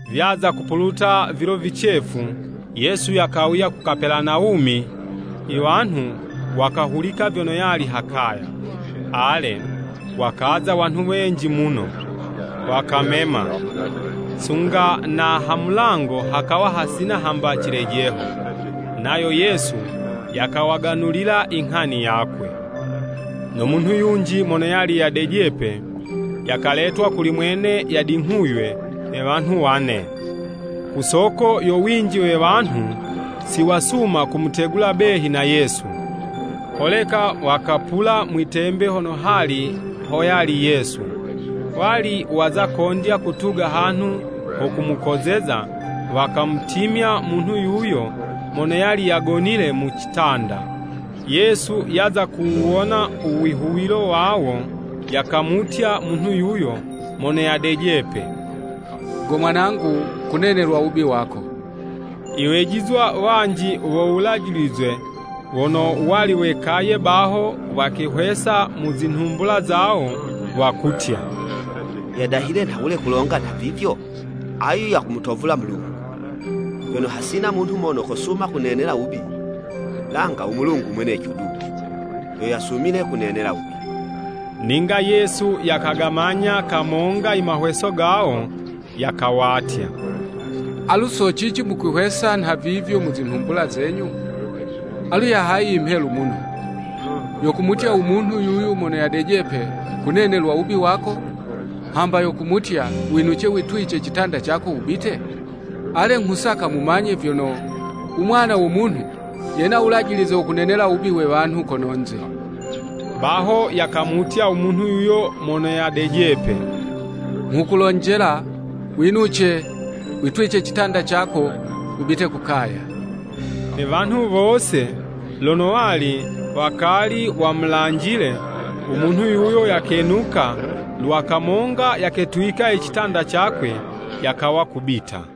Vyaza kupuluta vilo vicefu, Yesu yakawuya ku Kapelanawumi, iwanhu wakahulika vyono yali ha kaya. Ale, wakaza wanhu wenji muno, wakamema, sunga na ha mulango hakawa hasina hamba cilejeho. Nayo Yesu yakawaganulila inghani yakwe, no munhu yunji mono yali yadejepe, yakaletwa kuli mwene yadinghuywe na wanhu wane. Ku soko yo winji we wanhu, siwasuma kumutegula behi na Yesu. Holeka wakapula mwi'tembe hono hali hoyali Yesu. Wali waza kondya kutuga hanhu ho kumukozeza, wakamutimya munhu yuyo mono yali yagonile mu citanda. Yesu yaza kuwuwona uwihuwilo wawo, yakamutya munhu yuyo mono yadejepe, “Go mwanangu kunenelwa wubi wako.” Iwejizwa wanji wo Wulajilize wono wali wekaye baho, wakehwesa mu zinhumbula zawo wakutya, “Yadahile nhawule kulonga nha vivyo? Ayu yakumutovula Mulungu! Vyono hasina munhu mono kosuma kunenela wubi, langa u Mulungu mweneco du, yo yasumile kunenela wubi.” Ninga Yesu yakagamanya kamonga i mahweso gawo, yakawatya, “Alu socici mukwihwesa nhavivyo mu zinhumbula zenyu? Alu yahayi imhelu muno, yo kumutya u munhu yuyu mono yadejepe, kunenelwa wubi wako, hamba yo kumutya, ‘Winuce, witwice citanda cako wubite?’ Ale, nghusaka mumanye vyono, u Mwana wo Munhu, yena wulajilize wo kunenela wubi we wanhu kono'nze.” Baho yakamutya u munhu yuyo mono yadejepe, “Nghukulonjela, winuce, witwice citanda cako, wubite ku kaya!” Ne wanhu wose lono wali wakali wamulanjile, u munhu yuyo yakenuka lwa kamonga yaketwika i citanda cakwe, yakawa kubita.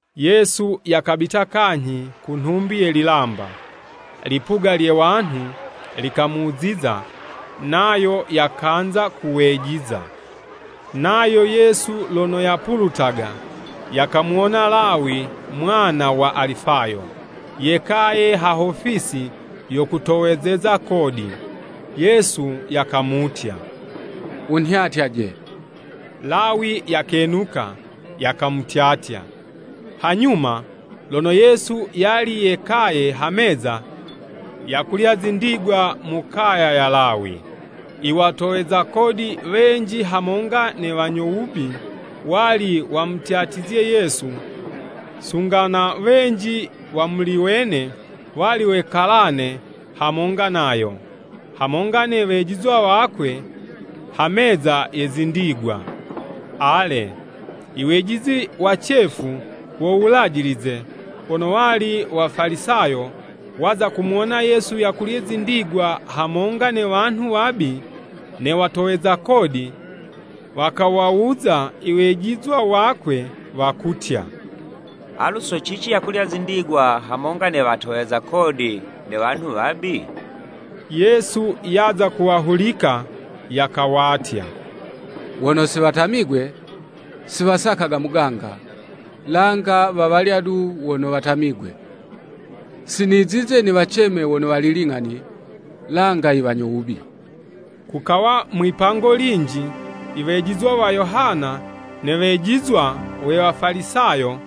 Yesu yakabita kanyhi ku nhumbi ye lilamba. Lipuga lye wanhu likamuziza, nayo yakanza kuwejiza. Nayo Yesu lono yapulutaga, yakamuwona Lawi mwana wa Alifayo, yekaye ha hofisi yo kutowezeza kodi. Yesu yakamutya, “Wunhyatyaje!” Lawi yakenuka, yakamutyatya. Hanyuma, lono Yesu yali yekaye ha meza yakulya zindigwa mu kaya ya Lawi. I watoweza kodi wenji hamonga ne wanyo wubi wali wamutyatizye Yesu, sunga na wenji wa muli wene, wali wekalane hamonga nayo, hamonga ne wejizwa wakwe ha meza ye zindigwa. Ale, iwejizi wacefu wo Wulajilize wono wali Wafalisayo, waza kumuwona Yesu yakulya zindigwa hamonga ne wanhu wabi ne watoweza kodi, wakawawuza iwejizwa wakwe, wakutya, “Alu socici yakulya zindigwa hamonga ne watoweza kodi ne wanhu wabi?” Yesu yaza kuwahulika, yakawatya, “Wono si watamigwe, siwasakaga muganga, langa wawalya du wono watamigwe. Sinizize niwaceme wono wali ling'ani, langa i wanyo wubi.” Kukawa mwipango linji, iwejizwa wa Yohana ne wejizwa we Wafalisayo,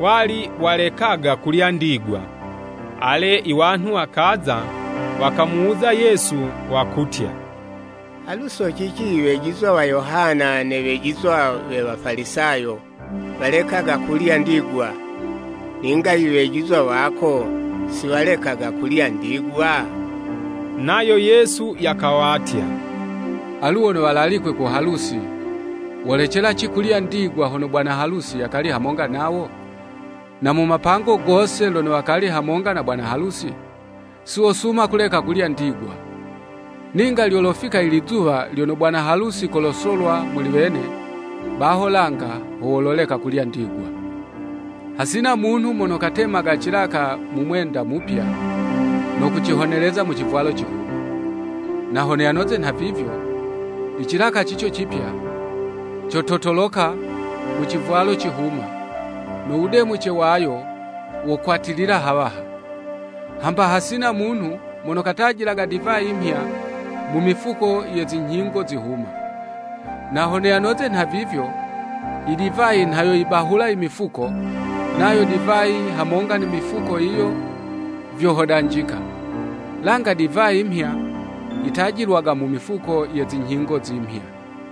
wali walekaga kulya ndigwa. Ale, iwanhu wakaza, wakamuwuza Yesu, wakutya, “Alu socici iwejizwa wa Yohana ne wejizwa we Wafalisayo, walekaga kulya ndigwa, ninga iwejizwa wako siwalekaga kulya ndigwa?” Nayo Yesu yakawatya, “Alu wono walalikwe ku halusi, wolecelaci kulya ndigwa hono bwana halusi yakali hamonga nawo? Na mu mapango gose lono wakali hamonga na bwana halusi, siwosuma kuleka kulya ndigwa. Ninga lyolofika i lizuwa lono bwana halusi kolosolwa muli wene, baho langa ho wololeka kulya ndigwa. “Hasina munhu mono katemaga cilaka mu mwenda mupya, no kucihoneleza mu civwalo cihuma. Na hono yanoze nhavivyo, icilaka cico cipya, cototoloka mu civwalo cihuma, no wudemuce wayo wokwatilila hawaha. Hamba hasina munhu mono katajilaga divayi mhya mu mifuko ye zinyhingo zihuma. Na hono yanoze nhavivyo, i divayi nha yoyibahula imifuko, nayo divayi hamonga ne mifuko yiyo vyohodanjika. Langa idivayi 'mhya, yitajilwaga mu mifuko ye zinyhingo zimhya!”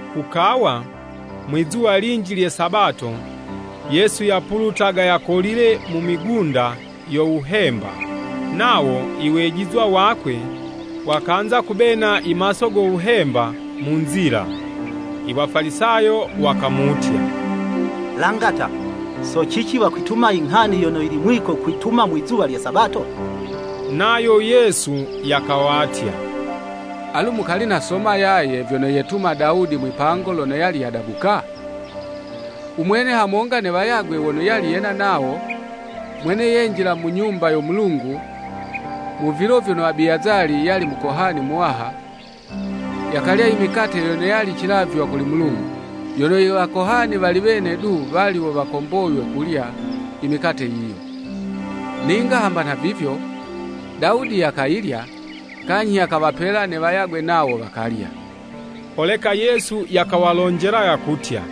Kukawa, mwizuwa linji lye Sabato, Yesu yapulutaga yakolile mu migunda yo wuhemba. Nawo i wejizwa wakwe wakanza kubena imaso go wuhemba mu nzila. Iwafalisayo wakamutya, “Langata! So cici wakwituma i nghani yono yili mwiko kwituma mwizuwa lye Sabato?” Nayo Yesu yakawatya, “Alu mukali nasoma yaye, vyono yetuma Dawudi mwipango lono yali yadabuka? U mwene hamonga ne wayagwe wono yali yena nawo, mwene yenjila mu Nyumba yo Mulungu mu vilo vyono Abiyazali yali mukohani muwaha, yakalya i mikate yono yali cilavywa kuli Mulungu. Yono Iwakohani wali wene du wo wali wakomboywe kulya i mikate yiyo. Ninga hamba nhavivyo, Dawudi yakayilya, kanyhi yakawapela ne wayagwe nawo wakalya.” Holeka Yesu yakawalonjela yakutya,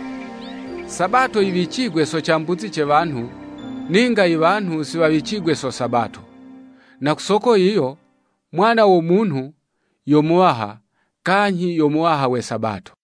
“Sabato yiwicigwe so cambuzi ce wanhu, ninga iwanhu si wawicigwe so Sabato.” Na ku soko yiyo, Mwana wo Munhu yo Muwaha, kanyhi yo Muwaha we Sabato.